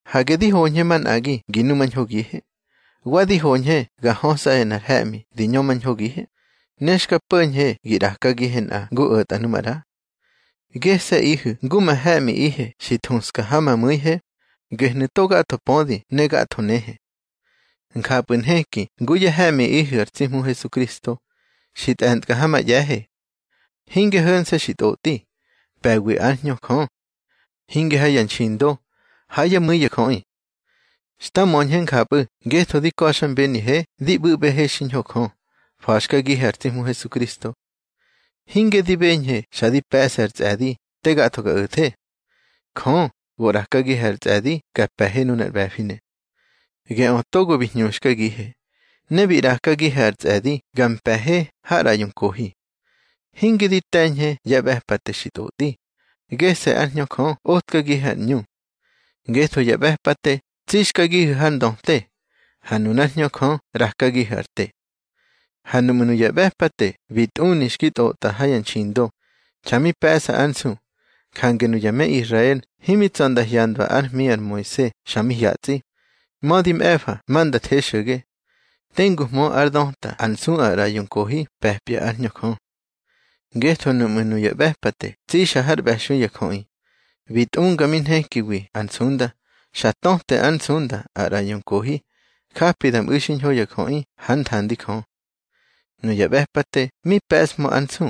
Hage di hoñhe manꞌagi gi numañhogihe. Wa di hoñhe ga hösꞌahe nꞌar he̱ꞌmi di ñömañhogihe, ne xka po̱ñhe gi ꞌrakagihe nꞌa ngu o̱tꞌa nu maꞌra. Gese̱ꞌihu̱ ngu ma he̱ꞌmiꞌihe xi thuska ha ma mu̱ihe, gehnu̱ to gatho pödi ne gatho nehe. Njapꞌu̱ nheki ngu yá he̱ꞌmiꞌihu̱ ar tsi Hmu Hesukristo, xi tꞌe̱nkꞌa ha ma ꞌye̱he. Hinge ho̱nse̱ xi tꞌotꞌi, pe̱wi ár Hñö Jö. Hinge ha ya nxindo, ha yá mu̱i ya jöꞌi. Xta möñhe njapꞌu̱ ngetho di ka̱xmbenihe di ꞌbu̱ꞌbehe xiñho Jö, fa̱xkagihe ar tsi Hmu Hesukristo. Hinge di beñhe xa di pe̱ꞌse ar tsꞌe̱di te gatho ga o̱the. Jö go ꞌrakagihe ar tsꞌe̱di ga pe̱he nunar ꞌbe̱finu̱. Geꞌö togo bi hñuxkagihe, ne bi ꞌrakagihe ar tsꞌe̱di ga mpe̱he har ꞌraꞌyo nkohi. Hinge di te̱ñhe ya ꞌbe̱pate xi tꞌotꞌi, gese̱ ár Hñö Jö otkagihe ar ꞌñu. Ngetho ya ꞌbe̱pate tsixkagihu̱ har ndöte, ha nunár Hñö Jö ꞌrakagihu̱ ar te. Ha nuꞌmu̱ nuya ꞌbe̱pate bi tꞌuni xki tꞌotꞌa ha ya nxindo, xa mi pe̱ꞌsa ár nsu, jange nuya me Israel himi tsa̱ nda hyandwa ár hmi ar Moise xa mi hyatsꞌi, mödi mꞌe̱fa ma nda the xo̱ge, tenguhmö ár döta ár nsu ar ꞌraꞌyo nkohi pe̱pya ár Hñö Jö. Ngetho nuꞌmu̱ nuya ꞌbe̱pate tsixa har ꞌbe̱xui ya jöꞌi, bi tꞌunga mi nhekiwi ar nsunda, xa töte ár nsunda ar ꞌraꞌyo nkohi, japi da mꞌu̱ xiñho ya jöꞌi hár nthandi Jö. Nuya ꞌbe̱pate mi pe̱ꞌshmö ár nsu,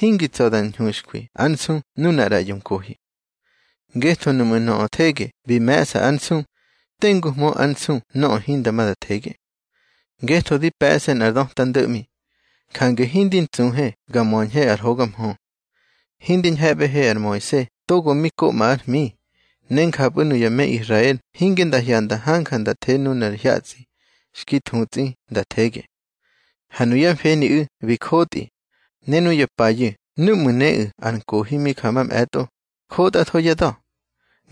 hingi tsa̱ da ñhuxkwi ár nsu nunar ꞌraꞌyo nkohi. Ngetho nuꞌmu̱ nöꞌö thege bi me̱ꞌsa ár nsu, tenguhmö ár nsu nöꞌö hinda ma da thege. Ngetho di pe̱ꞌse nꞌar döta ndo̱ꞌmi, jange hindi ntsuhe ga möñhe ar hoga mhö. Hindi ñhe̱ꞌbehe ar Moise togo mi koꞌma ár hmi, ne njapꞌu̱ nuya me Israel hinge nda hyanda hanja nda the nunar hyatsꞌi xki thutsꞌi nda thege. Ha nuyá mfeniꞌu̱ bi jotꞌi, ne nuya payu̱ núꞌmu̱ néꞌu̱ ar nkohi mi ja mamꞌe̱tꞌo, jotꞌatho yá da̱.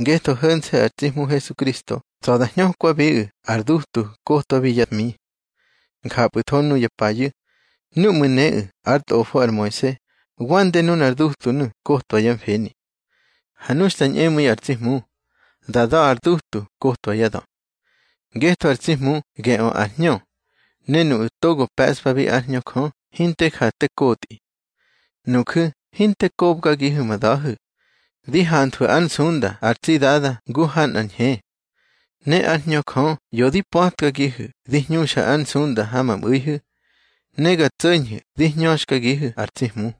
Ngetho ho̱nse̱ ar tsi Hmu Hesukristo tsa̱ da hñökwabiꞌu̱ ar dutu kotwabi yá hmi. Njapꞌu̱tho nuya payu̱, núꞌmu̱ néꞌu̱ ár tꞌofo ar Moise, wande nunar dutunu̱ kotwa yá mfeni. Ha nu xta ñꞌemu̱i ar tsi Hmu, da da̱ ar dutu kotwa yá da̱. Ngetho ar tsi Hmu geꞌö ar Hñö, ne nuꞌu̱ togo pe̱ꞌspa ár Hñö Jö, hinte ja te kotꞌi. Nuju̱ hinte kobgagihu̱ ma da̱hu̱. Di hanthwu̱ ár nsunda ar tsi Dada ngu ha nꞌar ñhe. Ne ár Hñö Jö ꞌyo di pa̱tkagihu̱ di hñuxa ár nsunda ha ma mꞌu̱ihu̱, ne ga tso̱ñhu̱ di hñöxkagihu̱ ar tsi Hmu.